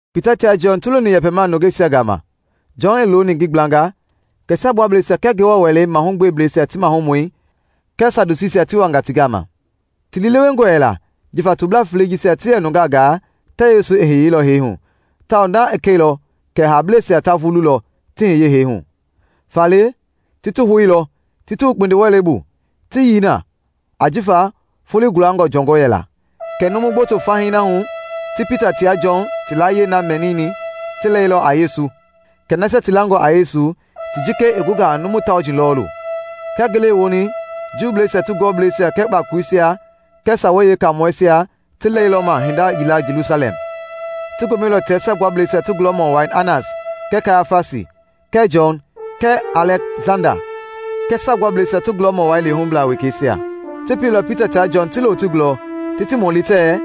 Pita tia Jɔn ti loni yɛpɛmaa nungeisia gama, Jɔn i looni ngi gblanga, kɛ Saagbuablɛisia kɛɛ Ngewɔ Wɛlei mahugbeblɛisia ti maahumɔi kɛɛ Sadusiisia ti wanga ti gama. Ti lii lewengɔ yɛla jifa toblaa felei jisia ti yɛ nungaa gaa tɛɛ Yesu i hiyeilɔ hee hu, tawao na i kɛilɔ kɛ haableisia ta vululɔ ti hiye hee hu. Faale, ti ti houilɔ ti ti wu kpindiwɛlei bu ti yii na ajifa foloi gulangɔ jɔngɔ yɛla. Kɛɛ numu gboto fahii na hu ti Pita tia Jɔn ti layie na mɛnini ti lɛilɔ a Yesu, kɛ nasia ti langɔ a Yesu ti jikei i gunga a numu tauji lɔɔlu. Kia ngele i woni Juuisia ti gulɔbleisia kɛɛ kpakoleisia kɛɛ Sawei Yeekaamɔisia ti lɛilɔma hinda yila Jelusalɛm. Ti gomɛilɔ tia Saagbuablɛisia ti gulɔmɔ wai Anas kɛɛ Kayafasi, kɛɛ Jɔn kɛɛ Alɛksanda kɛɛ Saagbuablɛisia ti gulɔmɔ wai lehublaa wekeisia. Ti pieilɔ Pita tia Jɔn ti lo ti gulɔ ti ti mɔli tɛɛ,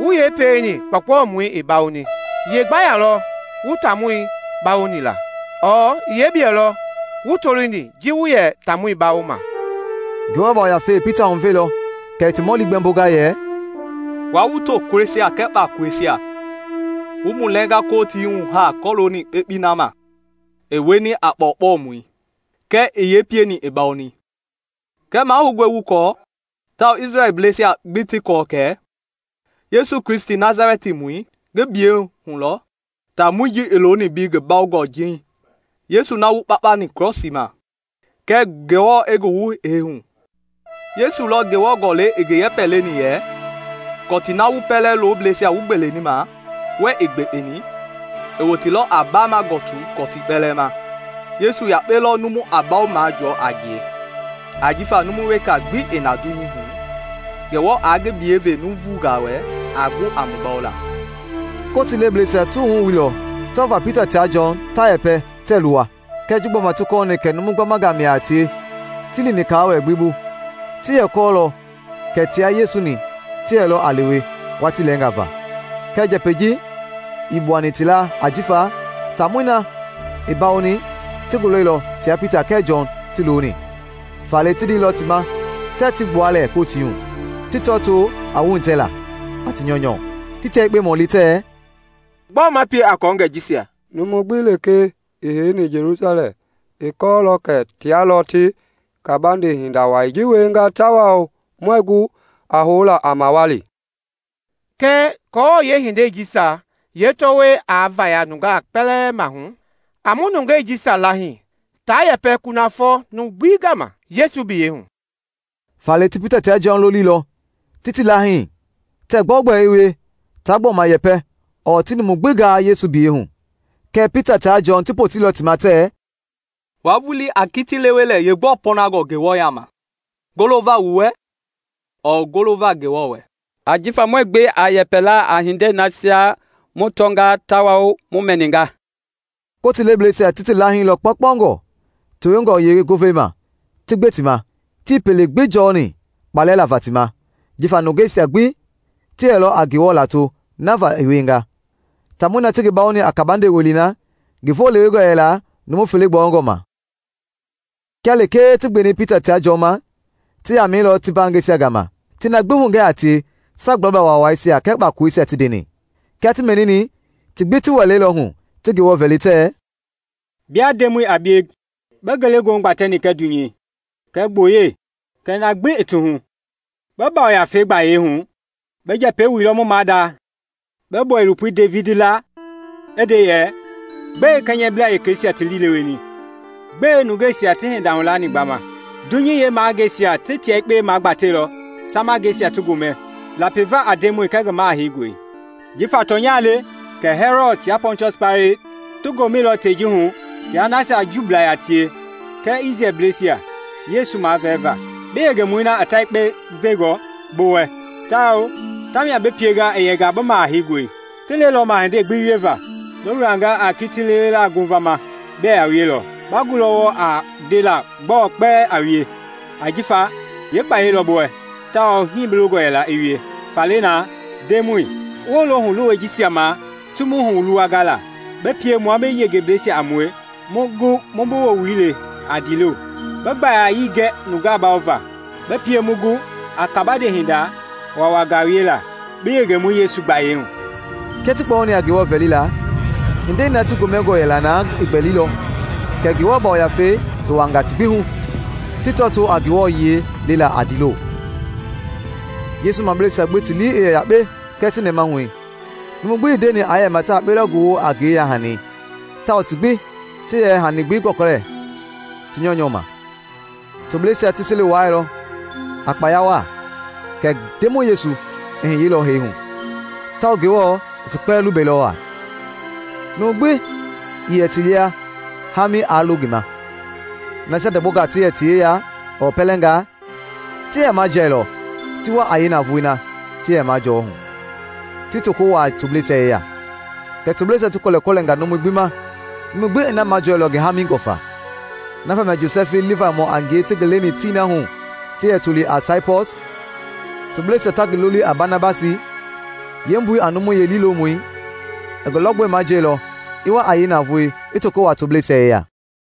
“Wu yee pieni kpɔɔkpɔmɔi i bawoni? Ye gbaya lɔ wu taamɔi bawoni la, ɔɔ yee biyɛ lɔ wu tolini ji wu yɛ taamɔi bawoma?” Ngewɔ Yafei i Pita huveilɔ kɛ i ti mɔli gbɛmbonga yɛ, “Wua wu tokulɔisia kɛɛ kpakoleisia, wu mu lɛnga Kotii hu haa kɔlooni kpekpei na ma i wieni a kpɔɔkpɔmɔi kɛɛ i yee pieni i bawoni, kɛɛ mahoungɔe wu kɔɔ, tawao Isrɛlbleisia gbi ti kɔɔ kɛ Yesu Kristi Nasalɛtimɔi ngi biyɛi gbayei hu lɔ taamɔi ji i looni mbei ngi bawongɔ jeiŋ. Yesu na wu kpakpani krɔsii ma kɛɛ Ngewɔ i ngi wu hee hu. Yesu lɔ Ngewɔ Gɔlɛi i ngi yɛpɛ leni yɛ, ‘Kɔtii na wu pɛlɛ loblɛisia wu gbeleni ma wɛɛ ii gbekpeni, i woteilɔ a baama gɔtu kɔtii kpɛlɛɛ ma.’ Yesu yakpe lɔ numu a mbawo majɔɔ a ngie ajifa numu weka gbi na dunyei hu Ngewɔ aa ngi biyɛi ve nuuvungaa wɛ a gu a mu bawola.” Kotii lebleisia ti wuhu i wuilɔ tɔvaa Pita tia Jɔn ta yɛpɛ tɛɛ luwa kɛɛ ji gbɔma ti kɔɔni kɛ numu gbamanga mia a tie, tii lini kaawɛlɛ gbi bu. Ti yɛ kɔɔlɔ kɛ tia Yesu-ni ti yɛlɔ a lewe watii lɛɛnga va. Kɛɛ njɛpɛ gbi ii gbuani ti laa ajifa taamɔi na i bawoni ti ngi lɔilɔ tia Pita kɛɛ Jɔn ti looni. Faale ti ndeilɔ ti ma tɛɛ ti gbua lɛɛ Kotii hu, ti tɔtoo a wuhitɛla a ti nyɔunyɔ. Ti tia yekpe mɔlilɔ tɛɛ, “Gbɔɔ ma pie a kɔɔngɛi jisia? Numu gbi lekee i heini Jelusalɛm i kɔɔlɔ kɛ tia lɔ ti kabande hinda wai ji wienga tawao muɛɛ gu a houla a mawali. Kɛɛ aako yeehindei ji yeetɔwɔi aa vaya nungaa kpɛlɛɛ maahu, a mu nungei jisia laahii taa yɛpɛ kunafɔ numu gbi gama Yesu biyɛi hu.” Faale ti Pita tia Jɔn loliilɔ ti ti laahii tɛɛ gbɛogbɛ i wie taa gbɔma yɛpɛ ɔɔ ti numu gbi gaa Yesu biyɛi hu. Kɛɛ Pita tia Jɔn ti poteilɔ ti ma tɛɛ, “Wua vulii a kiti lewe lɛɛ yeegbɔɔ pɔɔnangɔ Ngewɔ yaama, golova wu wɛ ɔɔ golova Ngewɔ wɛ. Ajifa muɛɛ gbe a yɛpɛla a hindei nasia mu tɔnga tawao mu mɛninga.” Kotii lebleisia ti ti laahilɔ kpaukpaungɔ tewengɔ yeengovei ma, ti gbe ti ma. Tii pele gbi jɔni kpalɛ lava ti ma, jifa nungeisia gbi ti yɛlɔ a Ngewɔ lato na va i wienga. Taamɔi na ti ngi bawoni a kabande welei na, ngi voo lewengɔ yɛla numu fele gbɔyɔngɔ ma. Kia lekee ti gbeni Pita tia Jɔn ma, ti yamɛilɔ ti mbaangɛisia gama ti na gbi hugɛ a tie Saagbuablaa Waawaisia kɛɛ kpakoleisia ti ndeni. Kia ti mɛnini, ti gbi ti wɛleilɔ-hu ti Ngewɔ vɛli tɛɛ, “Bia Ndemɔi a bie bi ngelegoohu gbatɛni kɛɛ dunyei kɛɛ gboyei kɛɛ na gbi i ti hu! Bi Yafei gbayei hu bi njɛpɛ wuilɔ mu maada, bi bɔilopoi Devidi laa i nde yɛ, ‘Gbɛe Kɛnyɛblaa wekeisia ti liileweni; gbɛe nungeisia ti hinda hulani gbama? Dunyei yeemahangeisia ti tia yekpe magbatɛilɔ, Samangɛisia ti gomɛ lapiva a Ndemɔi kɛɛ ngi Maha Heingɔi.’ Ajifa tɔnya le kɛ Hɛlɔd tia Pɔntiɔsi Paileti ti gomɛilɔ tei ji hu tia nasia Juubla yaa tie kɛɛ Isrɛlbleisia Yesu mavɛɛva, bi yengemɔi na i ta yekpe vengɔ bi wɛ tawao tamia bi pienga i yɛnga a bi Maha Heingɔi. Ti lɛilɔma hindei gbi wieva bi wilanga a kiti lewela ngovama bɛɛ a wielɔ. Ba gulɔ wɔɔ a ndela gbɔɔ kpɛlɛɛ a wie ajifa yeekpayɛi lɔ bi wɛ tawao hii bi longɔ yɛla i wie. Faale na, Ndemɔi, wolo huluwɛi jisia ma ti mu huluwanga la, bi pie mua bi yengebleisia a mue mu gu mu bi woowili le a ndiilo. Bi gbayayii gɛ nungaa bawova, bi pie mu gu a kabande hinda waawangaa wiela bi yengemɔi Yesu gbayei hu.” Kia ti kpɔyɔni a Ngewɔ vɛlila, hindei na ti gomɛngɔ yɛla na i gbɛlilɔ kɛ Ngewɔ Yafei i wuaanga ti gbi hu, ti tɔtoo a Ngewɔ yiɛi lela a ndiilo. Yesu mableisia gbi ti lii i yɛ yakpe kɛɛ ti nɛmahui. Numu gbi ii ndeni aa yɛma ta yakpe lɔ ngi woo a ngi yeya-hani, tawao ti gbi ti yɛ hani gbi gɔlɛkɔlɛlɔ ti nyɔunyɔu ma. Tobleisia ti seli wuailɔ a kpaya waa kɛ Ndemɔi Yesu i hiyeilɔ hee hu, tawao Ngewɔ i ti kpɛlɛɛ lubɛilɔ waa. Numu gbi ii yɛ ti lia haami aa lo ngi ma. Nasia ndɔgbɔngaa ti yɛ ti yeya ɔɔ pɛlɛngaa, ti yɛ majialɔ ti wa a yeenavoei na ti yɛ majɔɔ hu ti toko wuaa tobleisia yeya, kɛ tobleisia ti kɔlɛkɔlɛnga numui gbi ma, numu gbi i na majɔɔ ngi haamingɔ faa. Na vamia Josɛfi, Livaimɔ a ngie ti ngi leni tii na hu ti yɛ toli a Saipɔs, tobleisia ta ngi loli a Banabasi (yeembui a “Numu Liilomɔi”), i ngi lɔgbɔi majiɛilɔ, i wa a yee navoei, i toko wuaa tobleisia yeya.